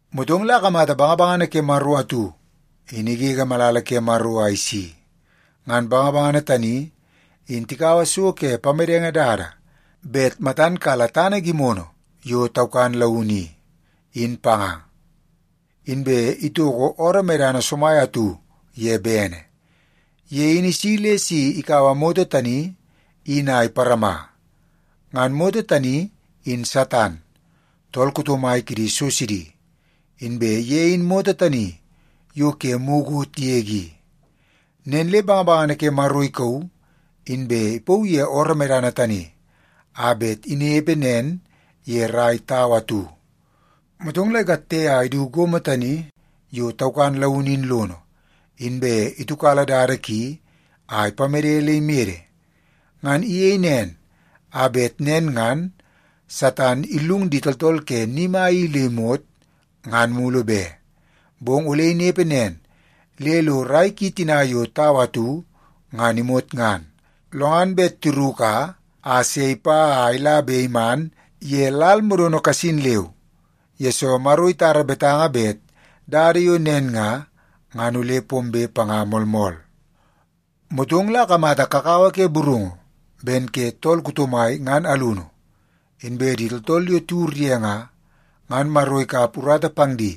Motong la akamata bangabangana ke Maro atu in igege malala ke Maro a isi. Ngan bangabangana tani in tikaua so ke pamedenge dada bet matan kala tana gimono yo taukan launu i, in panga, inbe itoko ooroo medana somai atu ye bene. Ye in isi le si ikaua moto tani in a iparama. Ngan moto tani in Satan, tool kuto mai kidi so sidi, inbe ye in moto tani yo ke mukot yege i. Nen le bangabangana ke Maro ikauu, inbe ipauu ye ooroo medana tani a bet inepe nen ye rai tau atu. Motong la ikatte a idu gomo tani yo taukan launu in lono, inbe itiukala dada ki a ipamede le imede. Ngan iyei nen a bet nen ngan Satan illung di tooltool ke ni mai i le imot, ngan mulu be. Bong ole inepe nen le lo rai ki tina yo tau atu ngan imot ngan, lo ngan bet tiruka a se ipa a ila be iman ye lal modono kasin leu, yesoo Maro itara betanga bet dada yo nen nga, ngan ole pombe panga moolmool. Motong la akamata kakawa ke burungu ben ke tool kuto mai ngan alunu. Inbe di tooltool yo tiwur ye nga, ngan Maro ikap urata pang di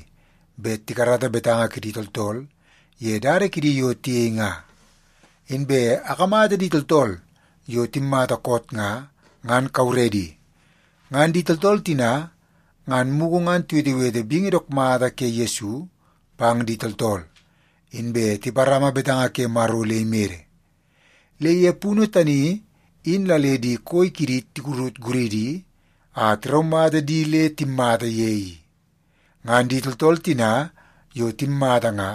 bet tikarata betanga kidi tooltool ye dada kidi yo tiyei nga. Inbe akamata di tooltool yo timmata koot nga, ngan kauredi. Ngan di tooltool tina ngan mugu ngan tiwetewete bingi dook mata ke Yesu pang di tooltool, inbe tiparama betanga ke Maro le imede. Le ye punu tani in la le di koi kidi tikurut guridi a tiraumata di le timmata ye i. Ngan di tooltool tina yo timmata nga,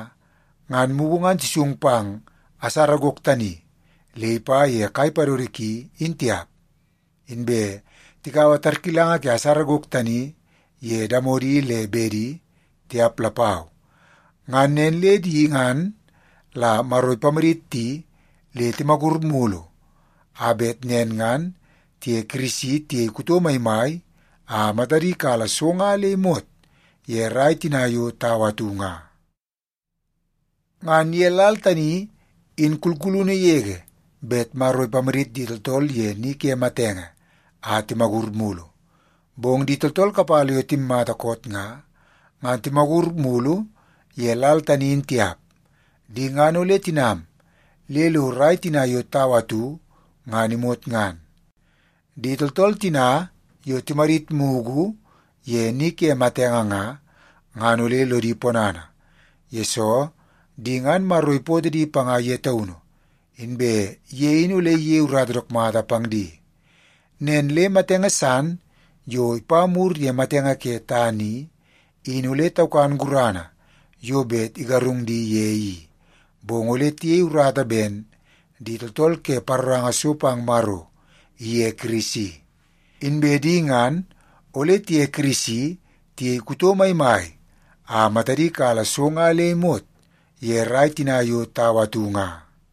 ngan mugu ngan tisung pang asara gok tani le ipa ye kai padodo ki in tiap, inbe tikaua tarkilanga ke asara gok tani ye damodi le bedi tiap lapau. Ngan nen le di ngan la Maro ipamadit di le timagur mulu a bet nen ngan tiye Kirisi tiyei kuto maimai a matadi kala so nga le imot ye rai tina yo tau atu nga. Ngan ye lal tani in kulkulunu yege bet Maro ipamadit di tooltool ye ni ke matenge a timagur mulu. Bong di tooltool kapala yo timmata koot nga, ngan timagur mulu ye lal tani in tiap. Di ngan ole tinam le lo rai tina yo tau atu ngan imot ngan. Di tooltool tina yo timadit mugu ye ni ke matenge nga, ngan ole lodi ponana, yesoo di ngan Maro ipootoo di panga ye taunu, inbe ye in ole iyei urata dook mata pang di. Nen le matenge san yo ipa mur ye matenge ke tana i, in ole taukan gurana yo bet igarung di ye i, bong ole tiyei urata ben di tooltool ke paroranga so pang Maro iye Kirisi. Inbe di ngan ole tiye Kirisi tiyei kuto maimai a matadi kala so nga le imot ye rai tina yo tau atu nga.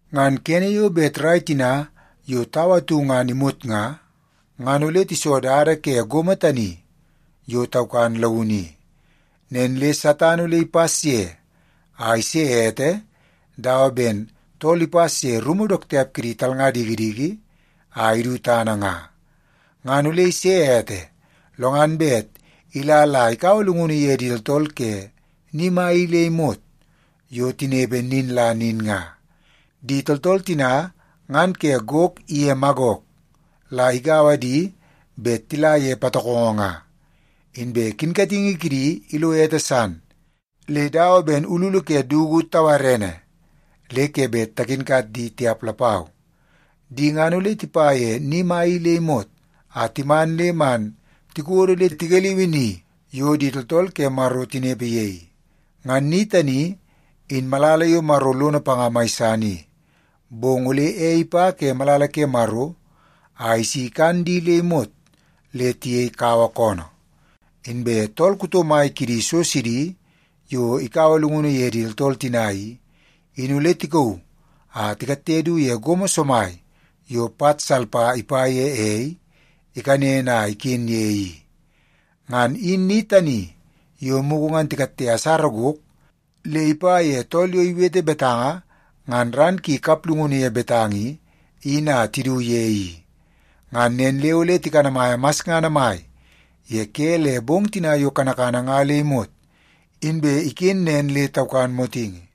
Ngan kene yo bet rai tina yo tau atu ngan imot nga, ngan ole tiso dada ke gomo tani yo taukan launu i. Nen le Satan ole ipas ye a ise ete dawa ben tool ipas ye rumu dook tiap ke di talnga dikidiki a idu tana nga. Ngan ole ise ete, lo ngan bet ila la ikaua llungunu ye di tooltool ke ni mai i le imot yo tinepe nin la nin nga. Di tooltool tina ngan ke Gok iye Magok la igaua di bet tila ye patokongo nga. Inbe kinkatingi kidi ilo ete san le dawa ben ululu ke dugu tawarene le ke bet takinkat di tiap lapau. Di ngan ole tipa ye ni mai i le imot a timan le man tikodo le tigaliui ni yo di tooltool ke Maro tinepe ye i. Ngan ni tani in malala yo Maro lono panga mai san i. Bong ole ei ipa ke malala ke Maro a isi ikan di le imot le tiyei kawa koonoo. Inbe tool kuto mai kidi so sidi yo ikaua llungunu ye di tooltool tina i, in ole tikauu a tikatte du ye gomo somai yo pat salpa ipa ye ei ikanen a iken ye i. Ngan in ni tani yo mugu ngan tikatte asara gok le ipa ye tool yo iwete betanga ngan ran ki kaplungunu ye betanga i, in a tidu ye i. Ngan nen le ole tikanamaia masngana mai ye ke le bong tina yo kanakana nga le imot inbe iken nen le taukan motingi.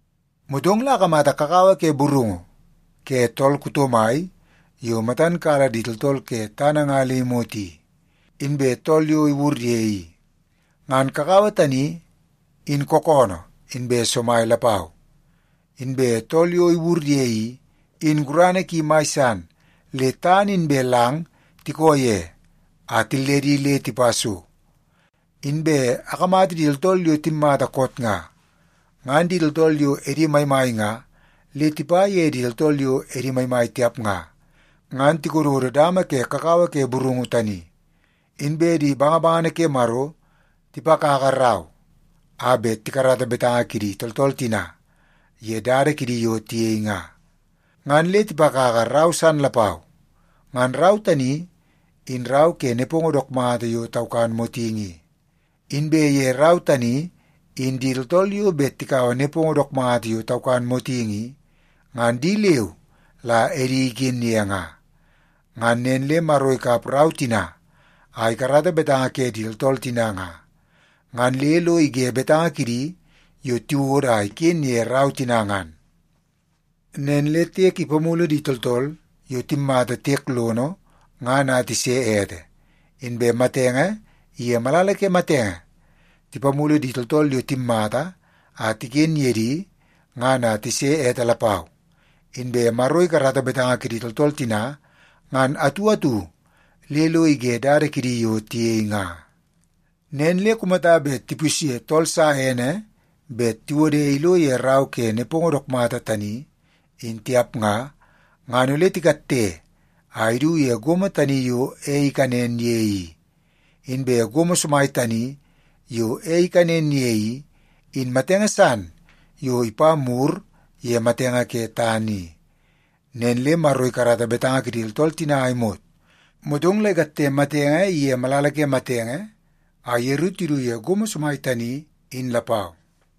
Motong la akamata kakawa ke burungu ke tool kuto mai yo matan kala di tooltool ke tana nga le imot i, inbe tool yo iwur ye i. Ngan kakawa tani in kookoonoo inbe somai lapau, inbe tool yo iwur ye i, in gurana ki mai san le tana inbe lang tikoo ye a tilledi le tipa so. Inbe akamata di tooltool yo timmata koot nga, ngan di tooltool yo edi maimai nga le tipa ye di tooltool yo edi maimai tiap nga, ngan tikododo dama ke kakawa ke burungu tani. Inbe di bangabangana ke Maro tipakaka rau a bet tikarata betanga kidi tooltool tina ye dada kidi yo tiyei nga. Ngan le tipakaka rau san lapau, ngan rau tani in rau ke nepongo dook mata yo taukan motingi i. Inbe ye rau tani in di tooltool yo bet tikaua nepongo dook mata yo taukan motingi i, ngan di leu la edi iken ye nga. Ngan nen le Maro ikap rau tina a ikarata betanga ke di tooltool tina nga, ngan le lo ige betanga kidi yo tiwodo a iken ye rau tina ngan. Nen le tiek ipamulu di tooltool yo timmata tiek lono ngan a tise ete, inbe matenge iye malala ke matenge tipamulu di tooltool yo timmata a tiken ye di ngan a tise ete lapau. Inbe Maro ikarata betanga kidi tooltool tina ngan atu atu le lo ige dada kidi yo tiyei nga. Nen le kumata le tipusye tool sa ene bet tiwode ilo ye rau ke nepongo dook mata tani in tiap nga, ngan ole tikatte a idu ye gomo tani yo ei ikanen ye i. Inbe gomo somai tani yo ei ikanen ye i, in matenge san yo ipa mur ye matenge ke tana i. Nen le Maro ikarata betanga kidi tooltool tina a imot, motong la ikatte matenge iye malala ke matenge a yeru tidu ye gomo somai tani in lapau.